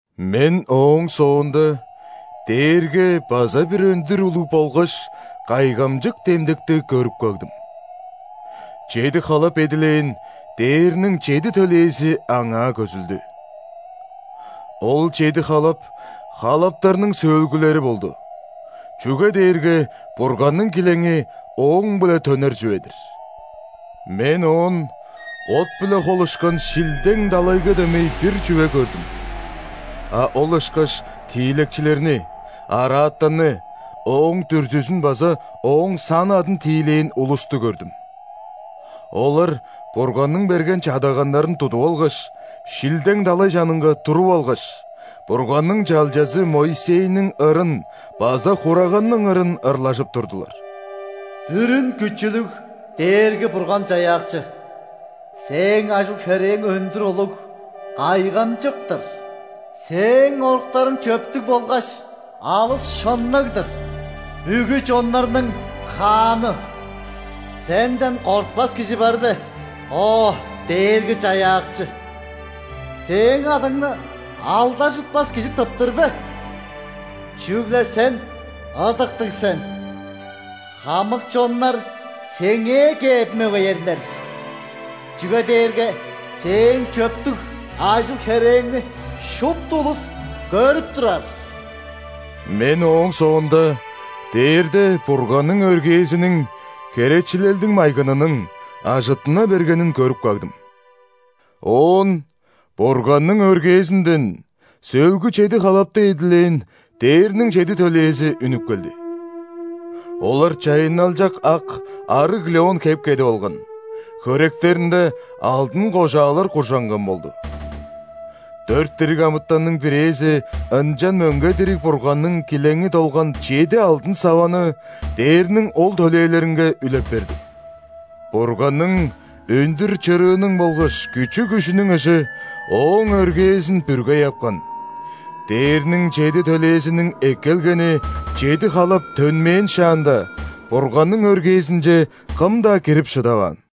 Мен ооң соонда дээрге база бир өндүр улуг болгаш кайгамчык демдекти көрүп кагдым: чеди халап эдилээн дээрниң чеди төлээзи аңаа көзүлдү. Ол чеди халап халаптарның сөөлгүлери болду, чүге дээрге Бурганның килеңи ооң-биле төнер чүве-дир. Мен оон от-биле холушкан шилдең далайга дөмей бир чүве көрдүм, а ол ышкаш тиилекчилерни – араатанны, ооң дүрзүзүн база ооң сан-адын тиилээн улусту көрдүм. Олар Бурганның берген чадаганнарын тудуп алгаш, шилдең далай чанынга туруп алгаш, Бурганның чалчазы Моисейниң ырын база Хураганның ырын ырлажып турдулар:«Бүрүн Күчүлүг Дээрги-Бурган-Чаяакчы,Сээң ажыл-херээң өндүр улуг, кайгамчык-тыр!Сээң оруктарың чөптүг болгаш алыс шынныг-дыр, бүгү чоннарның Хааны! Сенден кортпас кижи бар бе, о, Дээрги-Чаяакчы?Сээң адыңны алдаржытпас кижи тыптыр бе? Чүгле Сен ыдыктыг сен!Хамык чоннар Сеңээ кээп мөгеерлер,чүге дээрге Сээң чөптүг ажыл-херээңни шупту улус көрүп турар». Мен ооң соонда дээрде Бурганның өргээзиниң – херечилелдиң майгынының – ажыттына бергенин көрүп кагдым. Оон Бурганның өргээзинден сөөлгү чеди халапты эдилээн дээрниң чеди төлээзи үнүп келди. Олар чайынналчак ак арыг лён хеп кедип алган, хөректеринде алдын кожаалар куржанган болду. Дөрт дириг амытанның бирээзи ынчан мөңге дириг Бурганның килеңи долган чеди алдын саваны дээрниң ол төлээлеринге үлеп берди. Бурганның өндүр чырыының болгаш күчү-күжүнүң ыжы Ооң өргээзин бүргей апкан, дээрниң чеди төлээзиниң эккелгени чеди халап төнмээн шаанда, Бурганның өргээзинче кым-даа кирип шыдаваан.